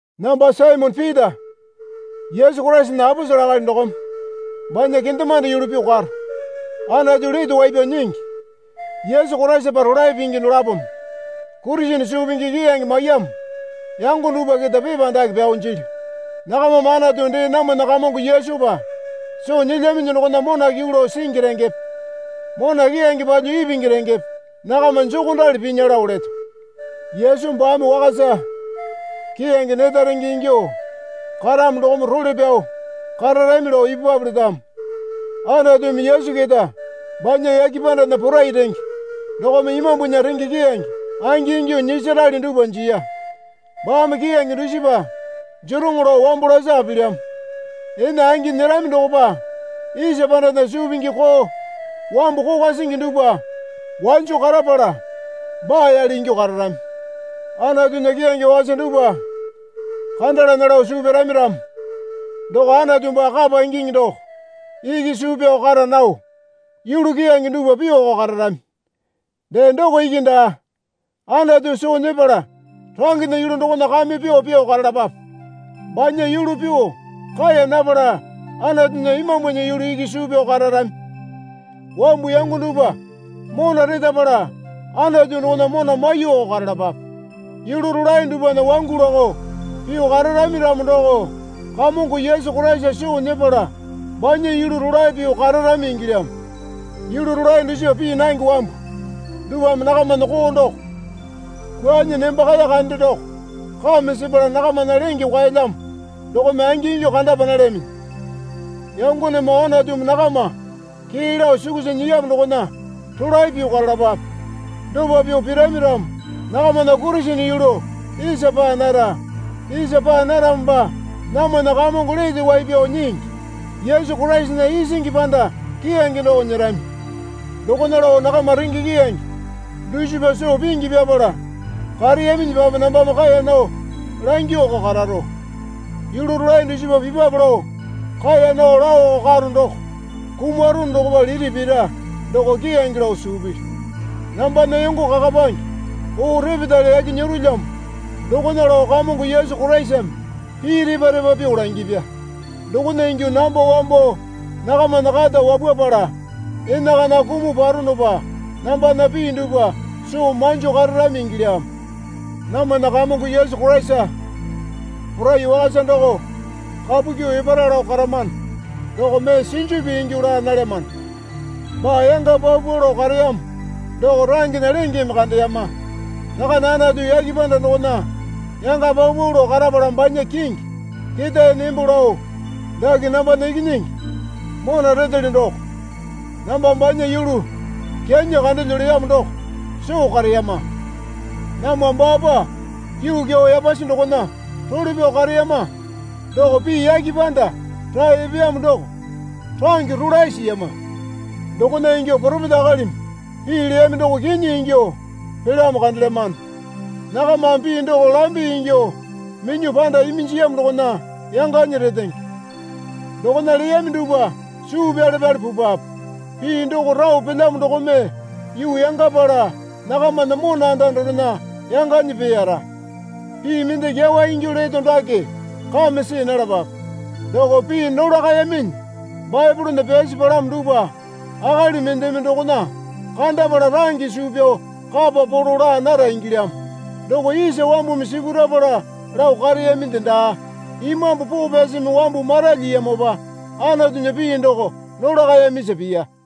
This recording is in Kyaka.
Namba Saimone Pita Yesu Koraisana aposele akali dokome banya kendemande yulu pyuo karo. Anatu Lete Wai Pyao Nyingi Yesu Koraisapa rolae pingi dolapome Kurisene suu pingi keyange maiyamo yango dupwa keta pepa dake pyao jilyu. Nakamame Anatu dee namwana Kamongo Yesupa soo nyilyaminyi dokona mona kyuu lao singi rengepe mona keyange palyuo ipingi rengepe nakama jokondali pinya lao leto. Yesu baame wakasa keyange neta renge ingyuo karamo dokome role pyao kararami lao ipupwape letamo. Anatumi Yesu keta banya yake pandana porai renge dokome imambunya renge keyange angingyuo nyisarali dupwa jiya. Baame keyange dusipa jeroŋo lao wambo lasaka pilyamo. Ene angi nyerami dokopa isa pandana suu pingi koo wambu kokwa singi dupwa wanjo karapala baa yale ingyuo kararami. Anatunya keyange wakasa dupwa kandalana lao suu pyarami ramo doko Anatu baa kapa ingingi doko iki suu pyao kara nao yulu keyange dupwa pyuoko kararami. Dee doko iki daa. Anatu soo nyepala rangena yulu dokona kame pyuo pyuo karalapape. Banya yulu pyuo kaeya napala Anatunya Imambunya yulu iki suu pyao kararami. Wambu yango dupwa mona retapala Anatu dokona mona maiyuoko karalapape. Yulu rolae dupwana wangu lakao pyuo kararami ramo doko Kamongo Yesu Koraisa soo nyepala banya yulu rolae pyuo kararami ingilyamo. Yulu rolae dusipa pii nange wambu dupwame nakamana koo doko kwuanyi nembakaya kande doko kame sepala nakamana lenge kwaelyamo dokome angingyuo kandapa nalyaminyi. Yangonemoo Anatumi nakama kee lao sukusa nyiyamo dokona rolae pyuo karalapape. Dopa pyuo pirami ramo nakamana Kurisene yulu isa paa nara. Isa paa naramopa namwana Kamongo Lete Wai Pyao Nyingi Yesu Koraisana isingi panda keyange doko nyerami. Dokona lao nakama renge keyange dusipa soo pingi pyapala kareyaminyipape nambame kaeya nao langyuoko kararo. Yulu rolae dusipa pipwape lao kaeya nao laoko karo doko kumarono dokopa lili pira doko keyange lao suu pilyu. Nambana yongo kakapange oo repetale yaki nyerolyamo dokona lao Kamongo Yesu Koraisame pii repa repa pyuo langipya. Dokona ingyuo namba wambo nakamana kata wapwapala enakana kumuo paronopa nambana pii dupwa soo manjo kararami ingilyamo. Namwana Kamongo Yesu Koraisa porai wakasa doko kapu kyuo epara lao karamano doko mee sinju pii ingyuo laa nalyamano. Baa yanga paupau lao kareyamo doko rangena lengeme kandeyama. Rakane Anatu yake panda dokona yanga paupau lao karapala banya kingi ketae nembo lao, Dake nambana Ikinyingi mona retelyo doko, namba banya yulu kyanyi kandelyo leyamo doko soo kareyama. Namwa baapa yuu kyau yapasi dokona role pyao kareyama doko pii yake panda rae epeyamo doko range rolae siyama. Dokona ingyuo poropeta akalimi pii leyami doko kinyi ingyuo pelyamo kandelyamano. Nakamame pii doko lambe ingyuo minyuo panda iminjiyamo dokona yanganyi retenge. Dokona leyami dupwa suu pyale pyale pupwape. Pii doko rao pelyamo dokome yuu yangapala nakamana mona anda dorena yanganyi peeyara. Pii mende kyawa ingyuo leto dake kame see nalapape. Doko pii nolakayaminyi Baepolena pyasi palamo dupwa akali mendeme dokona kandapala range suu pyao kapa polo laa nara ingilyamo. Doko isa wambumi sipurapala lao kareyaminde daa. Imambu Poo Pyasimi wambu maralyiyamopa Anatunya pii doko nolakayamisa piya.